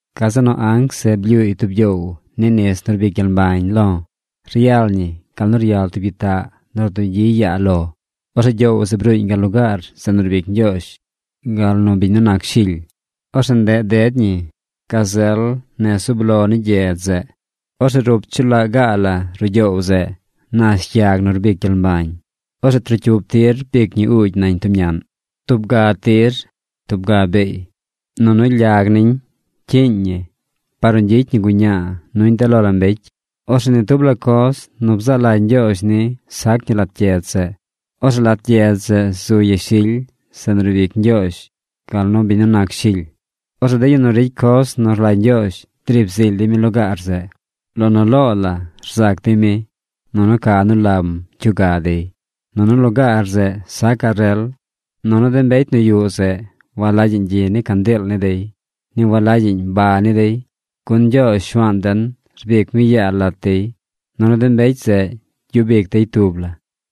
Gazeꞌ nu anc zeꞌ blyuuy tub gyoow ni nis nu rbic gyel mbañ lo̱. Ryal ñi gal nu ryal tub gyitaꞌ nu rdugyi yaa lo. Orzeꞌ gyoow zeꞌ bruuñ gal lugaar zeꞌ nu riib ic Ñgyoozh gal nu biñ nu nac Shily. Orzeꞌ ndeꞌ ded ñi gazel nez zub lo ni gyedz zeꞌ. Orzeꞌ rup chu laꞌ gaꞌ la ruꞌ gyoow zeꞌ nash yag nu rbic gyel mbañ. Orzeꞌ trocyup tir rbic ñi uugy nañ tub ñaꞌn: tub ga tir tub ga beey. Nunu lyag niñ cyiiñ ñi par nu gyicy ñi guñaa nuñ de lo la mbecy. Orzeꞌ ni tub la coz nu bzaa lagy Ñgyoozh ni sac ñi lat gyedz zeꞌ. Orzeꞌ lat gyedz zeꞌ zu yashily zeꞌ nu riib ic Ñgyoozh gal nu biñ nu nac Shily. Orzeꞌ de yu nu ricy coz nu rlagy Ñgyoozh driib zily dey mi lugaar zeꞌ. Lo nu loo la rzac dey mi, nunu ca nu lam cyuga dey. Nunu lugaar zeꞌ sacaꞌ rel. Nunu de mbecy nu yuꞌ zeꞌ walagyaꞌñ gyi ni candiil ni dey. Ni walagyaꞌñ ba ni dey. Gun Ñgyoozh Shuaan den rbic mi yaa lat dey. Nunu de mbecy zeꞌ gyub ic dey tub la.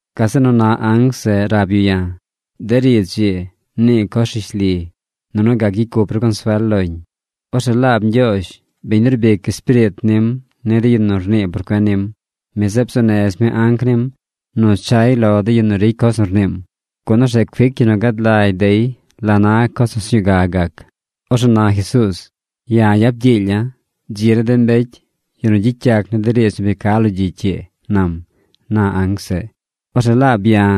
Gazeꞌ nu na anc zeꞌ rab yu ya̱: ―De riidz ii, nii coz rishli, nunu gac gyicy cup ru consuel loñ. Orzeꞌ laab Ñgyoozh, biñ nu rbic Espiriit nim ni de yu nu rnii por cuen nim, mi zeꞌ bzuu nez mi anc nim nu chay lo de yu nu ricy coz nu rniim, gun orzeꞌ cuic yu nu gad lagy dey la na coz nu sñuu ga gac. ’Orzeꞌ na Jesuuz: “¡Ya̱ yap gyiilya̱! ¡Dzi ni de mbecy, yu nu gyicy yac ni de riidz nu bi ca lo gyicy ii!” nam ―na anc zeꞌ. Orzeꞌ laab ya̱,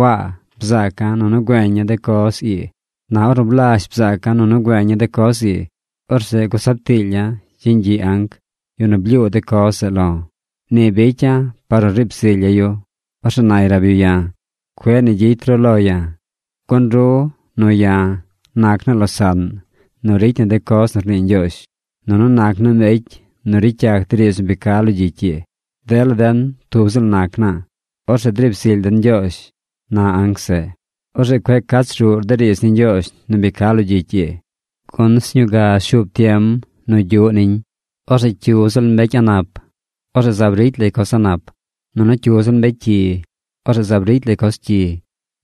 Waa, bzaaca̱ nunu güeña̱ de coz ii. Na ornu blazh bzaaca̱ nunu güeña̱ de coz ii, orzeꞌ gusab tiilya̱ yeñ gyiꞌ anc, yu nu blyuu de coz zeꞌ lo̱. Ni bicya̱ par nu riib zilya̱ yu. Orzeꞌ nay rab yu ya̱: ―¡Cueꞌ ni gyicy ru lo ya̱! Gun ru nu ya̱ nac naa losaꞌn nu ricy na de coz nu rnii Ñgyoozh, nunu nac naa mbecy nu ricy yac de riidz nu bi ca lo gyicy ii. Dela den tub ziꞌl nac naa. Orzeꞌ driib zily den Ñgyoozh ―na anc zeꞌ―. ’Orzeꞌ cueꞌ cach ruꞌr de riidz ni Ñgyoozh nu bi ca lo gyicy ii, gun sñuu ga shuub tiem nu gyuꞌ niñ. Orzeꞌ cyu ziꞌl mbecy a̱ꞌ nap, orzeꞌ zaab ricy lay coz a̱ꞌ nap. Orzeꞌ cyu ziꞌl mbecy cyi, orzeꞌ zaab ricy lay coz cyi.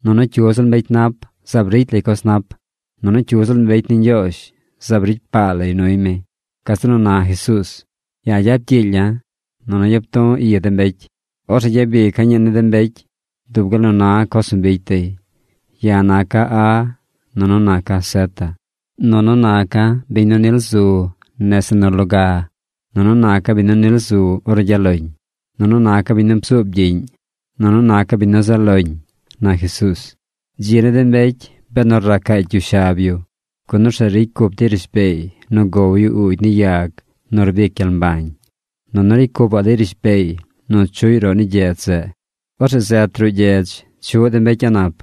Orzeꞌ cyu ziꞌl mbecy nap zaab ricy lay coz nap. Nunu cyu ziꞌl mbecy ni Ñgyoozh, zaab ricy paa lay nuy mi. Gazeꞌ nu na Jesuuz: ―¡Ya̱ yap gyiilya̱! Nunu yap du̱ i de mbecy. Orzeꞌ gyabica̱ ñii ni de mbecy dub gal nu na coz nu bicy dey. Ya̱ naca̱ A, nunu naca̱ zeta. Nunu naca̱ biñ nu nil zu nese nu loga. Nunu naca̱ biñ nu nil zu ornu gyaꞌ loñ. Nunu naca̱ biñ nu bzuub gyiꞌñ. Nunu naca̱ biñ nu zaꞌ loñ ―na Jesuuz. Dzi ni de mbecy, benu racaacy yu shab yu, gun orzeꞌ ricy cup dey rishbeey nu gow yu uugy ni yag nu rbic gyel mbañ. Nunu ricy cupaꞌ dey rishbeey nu chuꞌy roꞌ ni gyedz zeꞌ. Orzeꞌ zet ruꞌ gyedz chuꞌ de mbecy a̱ꞌ nap.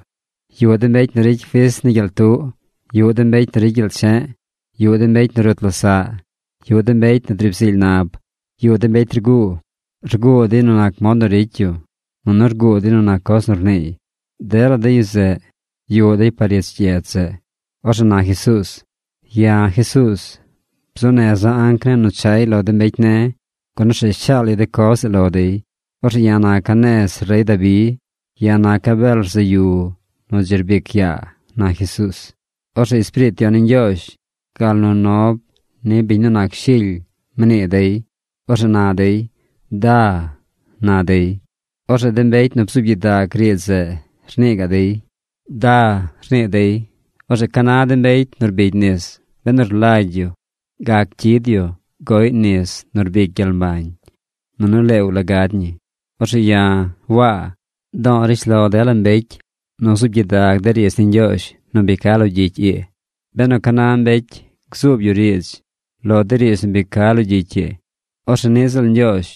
Yuꞌ de mbecy nu ricy fis ni gyel tuꞌ. Yuꞌ de mbecy nu ricy gyel che̱ꞌ. Yuꞌ de mbecy nu rut losaꞌ. Yuꞌ de mbecy nu driib zily nab. Yuꞌ de mbecy rguu. Rguu dey nu nac mod nu ricy yu. Nunu rguu dey nu nac coz nu rniiy. Dela de yu zeꞌ yuꞌ dey par ich gyedz zeꞌ. Orzeꞌ na Jesuuz: ―Ya̱, Jesuuz, bzuu neza̱ anc ne̱ nu chay lo de mbecy ne̱, gun orzeꞌ shaal yu de coz zeꞌ lo dey. Orzeꞌ ya̱ naca̱ nez rey Dabi. Ya̱ naca̱ bel rzaꞌ yu nu dzi rbic yaa ―na Jesuuz. Orzeꞌ Espiriit Yon ni Ñgyoozh gal nu nob ni biñ nu nac Shily mnii dey. Orzeꞌ na dey: ―¡Da! ―na dey. Orzeꞌ de mbecy nu bzuub gyidag riidz zeꞌ rnii gaꞌ dey: ―¡Da! ―rnii dey. Orzeꞌ ca na de mbecy nu rbigy nis, benu rlagy yu, gac cyid yu goꞌy nis nu rbic gyel mbañ. Nunu leew la gad ñi. Orzeꞌ ya̱, Waa, do̱o̱ rishlo dela mbecy nu zuub gyidag de riidz ni Ñgyoozh nu bi ca lo gyicy ii. Benu ca na mbecy gzuub yu riidz lo de riidz nu bi ca lo gyicy ii, orzeꞌ niꞌ ziꞌl Ñgyoozh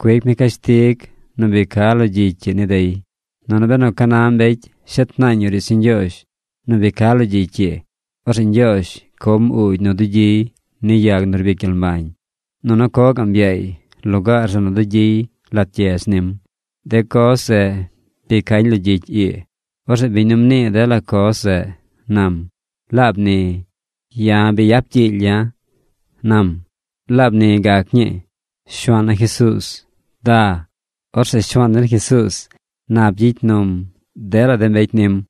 cuic mi cashtig nu bi ca lo gyicy ii ni dey. Nunu benu ca na mbecy shet naañ yu riidz ni Ñgyoozh nu bi ca lo gyicy ii, orzeꞌ Ñgyoozh com uugy nu dugyiy ni yag nu rbic gyel mbañ, nunu co gaꞌm yaay lugaar zeꞌ nu dugyiy lat gyedz nim. De coz zeꞌ bi cañ lo gyicy ii. Orzeꞌ biñ nu mnii dela coz zeꞌ nam: ―Laab ni. ¡Ya̱ bi yap gyiilya̱! ―nam. Laab ni gac ñii. ¡Shuaan na Jesuuz, da! Orzeꞌ Shuaan den Jesuuz nap gyicy num dela de mbecy nim.